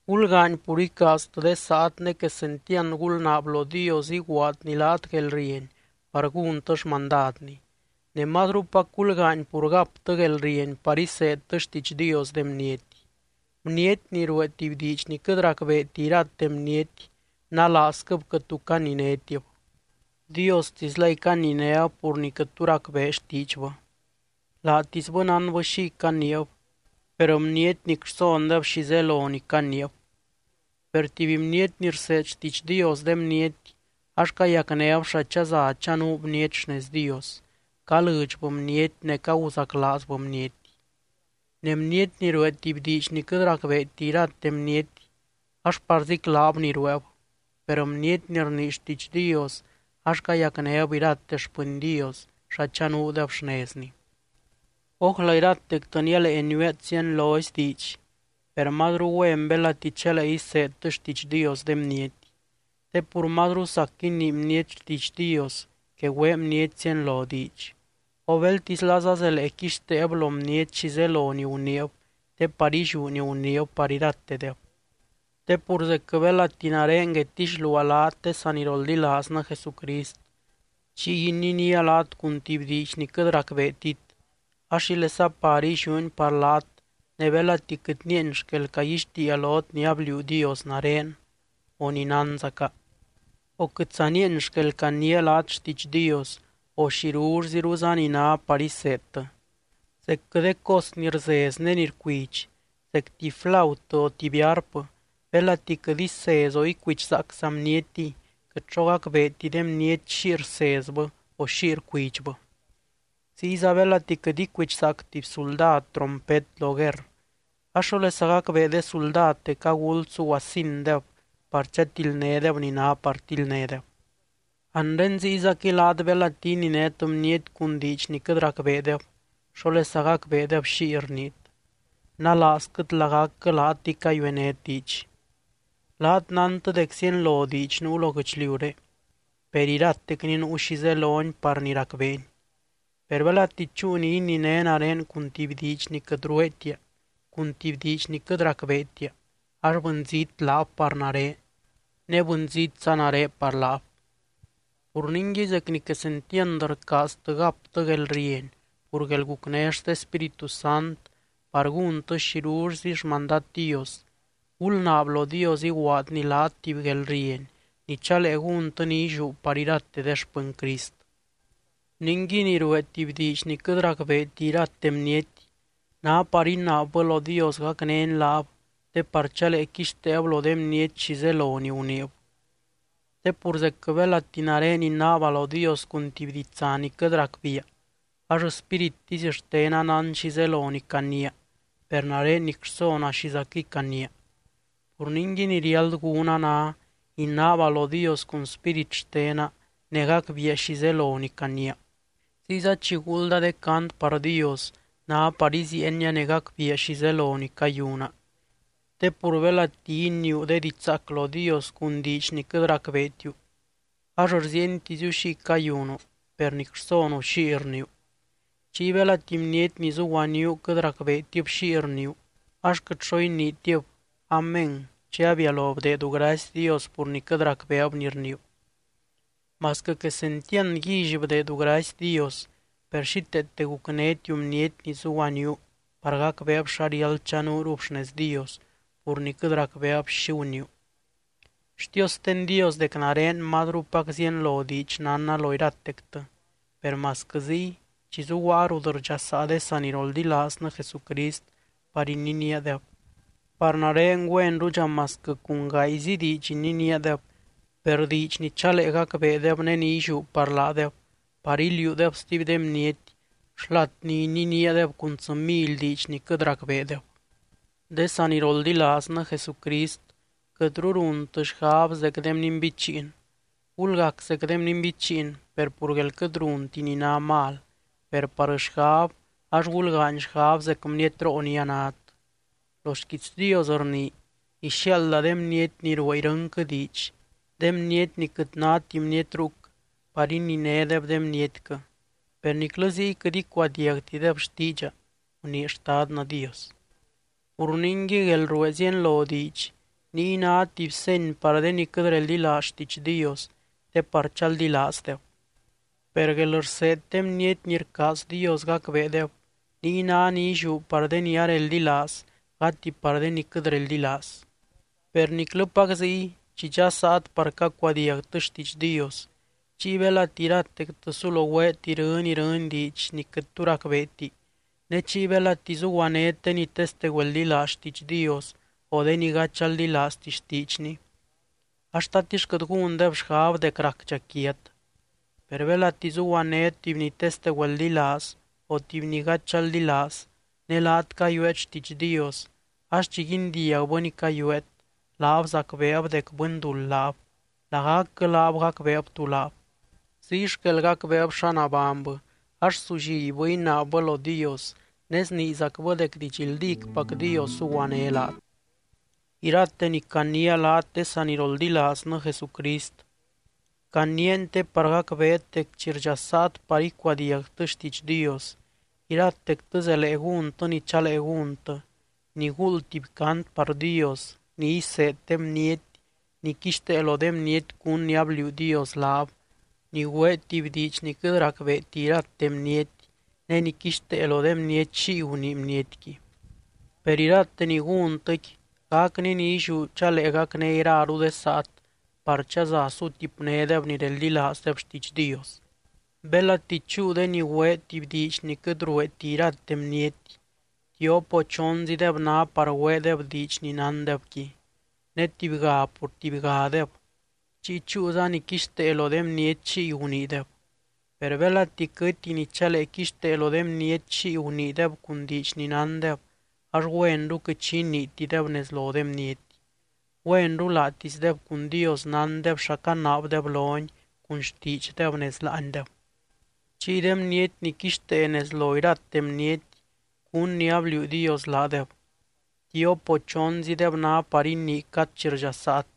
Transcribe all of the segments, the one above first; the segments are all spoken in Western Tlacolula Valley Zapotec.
Gulgaany pur icaaztɨ de saat ne quesentiand gulnaab lo Dios iguaadny laat guelrieny par gúntɨ xmandadny, ne mazrupac gulgaany pur gaptɨ guelrieny par iseedtɨ xtiidx Dios de bniety. Bniety ni ruee tuby diidx ni quɨt racbeeti irate bniety, nalaazquɨb quɨt tu caninétib. Diostislay caninéb pur ni quɨt tu racbee xtiidxbɨ, laatisbɨ nánbɨ xiy caniib per bniety nic rsondeb xi zelo ni caniib. Per tuby bniety ni rseed xtiidx Dios de bniety ax cayacnéb xa chaza chanuu bniety xnez Dios, calɨdxbɨ bniety ne caguzaclaazbɨ bniety. Ne bniety ni ruee tuby diidx ni quɨt racbeeti irate bniety ax parziclab ni rueeb, per bniety ni rnii xtiidx Dios ax cayacnéb irate xpɨny Dios xa chanuudeb xnezny. Ójla iratectɨ nialee niueet zienlozy diidx, per mazru güen belati chalee iseedtɨ xtiidx Dios de bniety. Te pur mazru sac inii bniety xtiidx Dios que güee bniety zienlo diidx, o beltislaza zelee quixteeb lo bniety xi zelo ni guniib te par illiú ni guniib par iratedeb. Te pur zecquɨ belati nare guedtixluaa laat de saniroldilaaznɨ Jesucrist, chiy ininía laat cun tuby diidx ni quɨt racbeetit ax ¿xílesa par illiúni par laat ne belati quɨt nieeny xquel caguixtiia lot ni abliuu Dios nare o ni nánzaca, o quɨtza nieeny xquel caniia laat xtiidx Dios o xirullziruza ni ná par iseedtɨ? Zecquɨ de cos ni rzez ne ni rcuidx, zec tuby flautɨ o tuby arp belati quɨt isez o icuidxzaacza bnietiy quɨt xo gacbeeti de bniety xiy rsezbɨ o xiy rcuidxbɨ. Ziyza belati quɨt icuidxzaac tuby suldad trompet lo guerr ax, ¿xólesa gacbee de suldad dec aguld suguasindeb par chatildnédeb ni ná par tildnédeb? Anre ziyzaquɨy laat belati ininét bniety cun diidx ni quɨt racbeedeb, ¿xólesa gacbeedeb xiy rniit? ¡Nalaazquɨt lagacquɨ laatɨy caguenét diidx! Laat nántɨ dec zienlo diidx nuu lo guɨchliuré, per iratecni nuu xi zeloni par ni racbeeni. Per belati chúu ni ininé nare cun tuby diidx ni quɨt rueetia, cun tuby diidx ni quɨt racbeetia ax bɨnzít laab par nare ne bɨnzítza nare par laab. Pur ningui zec ni quesentiand rcaaztɨ gaptɨ guelrieny pur guelgucné xte Spíritu Sant par gúntɨ xirullzi xmandad Dios, gulnaab lo Dios iguaadny laat tuby guelrieny ni chalee gúntɨ ni illiú par irate de xpɨny Crist. Ningui ni ruee tuby diidx ni quɨt racbeeti irate bniety, ná par inaabbɨ lo Dios gacnény laab te par chalee quixteeb lo de bniety xi zelo ni guniib. Te pur zecquɨ belati nare inaaba lo Dios cun tuby ditsa ni quɨt racbiia ax spírittisy xtena nán xi zelo ni caniia, per nare nic rsona xizaquɨy caniia. Pur ningui ni riáld gúna ná, inaaba lo Dios cun spírit xtena ne gacbiia xi zelo ni caniia. Ziyza chi guulda de cant par Dios ná par iziienia ne gacbiia xi zelo ni cayuna. Te pur belati iniiu de diidx zaac lo Dios cun diidx ni quɨt racbeetiu ax rziientiziu xiy cayunu, per nic rsonu xiy rniiu. Chiy belati bniety ni zuguaníu quɨt racbeetib xiy rniiu, ax quɨt xo iniitib “Amén” chi abialo bdeedu gracy Dios pur ni quɨt racbeeb ni rniiu. Masquɨ quesentiand guílly bdeedu gracy Dios, per xíteete gucnétiu bniety ni zuguaníu par gacbeeb xa riáld chanuurub xnez Dios pur ni quɨt racbeeb xi guniiu. Xtiosten Dios dec nare mazrupac zienlo diidx nánna lo iratectɨ. Per masquɨ ziy chi zuguaa rut rdxasaa de saniroldilaaznɨ Jesucrist par ininíadeb, par nare güenrudxa masquɨ cun gaayzi diidx ininíadeb, per diidx ni chalee gacbeedeb ne ni illiú par laadeb par iliuudeb stuby de bniety xlat ni ininíadeb cun tsɨ mily diidx ni quɨt racbeedeb. De saniroldilaaznɨ Jesucrist, quɨtru runtɨ xgab zec de bninbichiin. Gulgac zec de bninbichiin per pur guél quɨt runti ni ná mal, per par xgab ax gulgaany xgab zec bnietroo ni anát. Lo xquiits Dios rnii: “Ixiaalda de bniety ni ruee irɨnquɨ diidx, de bniety ni quɨt náti bniety ruc par ininédeb de bnietquɨ. Per niclɨ ziy quɨt icuadiagtideb xtiidxa, gunii Xtadnɨ Dios.” Pur ningui guelruee zienlo diidx, niy ná tuby seny par de ni quɨt reldilaaz xtiidx Dios te par chaldilaazdeb. Per guelrseed de bniety ni rcaaz Dios gacbeedeb, niy ná ni illiú par de ni areldilaaz gati par de ni quɨt reldilaaz. Per niclɨpac ziy chi dxasaat par cacuadiagtɨ xtiidx Dios, chiy belati iratectɨ sulo güeet irɨny irɨny diidx ni quɨt tu racbeeti ne chiy belati zuguanét de ni teste güeldilaaz xtiidx Dios o de ni gady chaldilaazti xtiidxny ax, ¿tatix quɨt gúndeb xgab dec racdxa quiat? Per belati zuguanét tuby ni teste güeldilaaz o tuby ni gady chaldilaaz ne laat cayueet xtiidx Dios, ax chi guindiagbɨ ni cayueet, laab zacbeeb dec bɨnduld laab, lagacquɨ laab gacbeeb tú laab. Ziy xquel gacbeeb xa nabánybɨ ax sullibbɨ inaabbɨ lo Dios, ne sniizacbɨ dec didxldícpac Dios zuguané laat. Irate ni caniia laat de saniroldilaaznɨ Jesucrist, caniiani te par gacbeet dec chi rdxasaat par icuadiagtɨ xtiidx Dios, iratectɨ zelee gúntɨ ni chalee gúntɨ, ni guuld tuby cant par Dios, ni iseed de bniety, ni quixtee lo de bniety cún ni abliuu Dios laab, ni güee tuby diidx ni quɨt racbeeti irate bniety ne ni quixtee lo de bniety xiy gunii bnietqui. Per irate ni gúntɨqui gacni ni illiú chalee gacné iraru de saat par chaza sutipnédeb ni reldilaazdeb xtiidx Dios. Belati chúu de ni güee tuby diidx ni quɨt rueeti irate bniety, tiop o chonzideb ná par güeedeb diidx ni nándebqui, ne tubyga pur tubygadeb, chiy chúuza ni quixtee lo de bniety xiy guniideb. Per belati quɨty ni chalee quixtee lo de bniety xiy guniideb cun diidx ni nándeb, ax güenru quɨt xi iniitideb nez lo de bniety. Güenru laatisdeb cun Dios nándeb xa canaabdeb lony cun xtiidxdeb nez láandeb. Chiy de bniety ni quixtee nez lo irate bniety cún ni abliuu Dios laadeb, tiop o chonzideb ná par inii cad chi rdxasaat,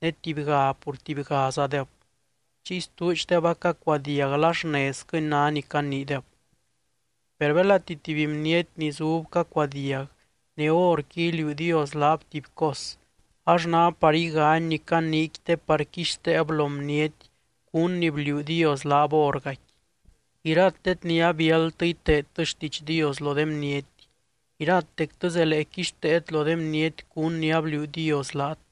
ne tubyga pur tubygazadeb. Chiy stuudxdeb acacuadiag la xnezquɨni ná ni caniideb. Per belati tuby bniety ni zub cacuadiag ne horqui iliuu Dios laab tuby cos, ax ná par igany ni caniiqui te par quixteeb lo bniety cún ni bliuu Dios laab hórgaqui. Iratet ni abiáldtɨ iteedtɨ xtiidx Dios lo de bniety, iratectɨ zelee quixteet lo de bniety cún ni abliuu Dios laat,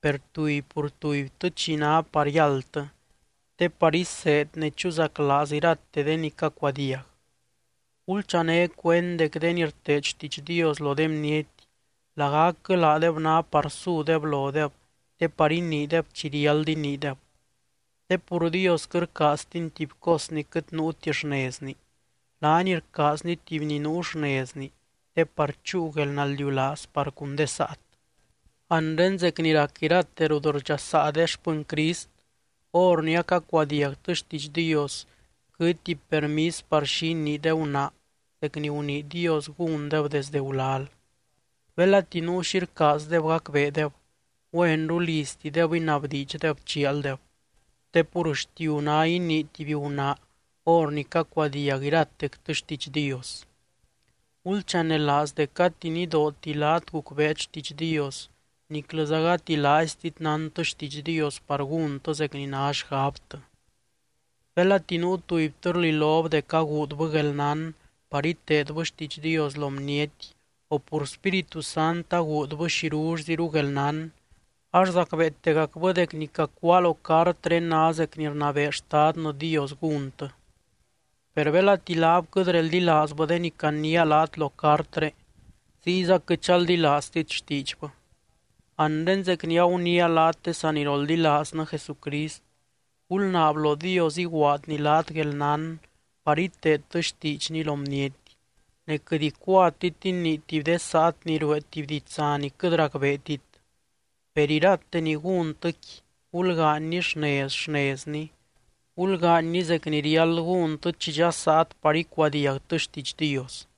per tuby pur tubytɨ chi ná par yáldtɨ te par iseed ne chuzaclaaz irate de ni cacuadiag. Gulchané cuend dec de ni rteed xtiidx Dios lo de bniety, lagacquɨ laadeb ná par sudeb lodeb te par iniideb chi riáld iniideb. Te pur Dios quɨt rcaaztiny tuby cos ni quɨt nuuti xnezni, laany rcaazny tuby ni nuu xnezni te par chúu guelnaldiulaaz par cun de saat. Anre zec ni rac irate rut rdxasaa de xpɨny Crist, hor ni acacuadiagtɨ xtiidx Dios quɨtti permis par xi inii de gunaa zec ni gunii Dios gúndeb desde gulal. Belati nuu xi rcaazdeb gacbeedeb, güenru liztideb inabdiidxdeb chialdeb, te pur xtiu ná inii tuby gunaa hor ni cacuadiag iratectɨ xtiidx Dios. Gulchanelaaz dec gati nidooti laat gucbeet xtiidx Dios niclɨza gati laaiztit nántɨ xtiidx Dios par gúntɨ zec ni ná xgabtɨ. Belati nuu tubytɨ rlilob dec aguudbɨ guelnán par iteedbɨ xtiidx Dios lo bniety o pur Spíritu Sant aguudbɨ xirullziru guelnán, ax zacbeetegacbɨ dec ni cacuáa lo cartré ná zec ni rnabee Xtadnɨ Dios gúntɨ. Per belati laab quɨt reldilaazbɨ de ni caniia laat lo cartré, ziyza quɨt chaldilaaztit xtiidxbɨ. Anre zec ni aguniia laat de saniroldilaaznɨ Jesucrist, gulnaab lo Dios iguaadny laat guelnán par iteedtɨ xtiidxny lo bniety, ne quɨt icuatit inii tuby de saat ni ruee tuby ditsa ni quɨt racbeetit. Per irate ni gúntɨqui, gulgaanyni xnez, xnezni, gulgaanyni zec ni riáld gúntɨ chi dxasaat par icuadiagtɨ xtiidx Dios.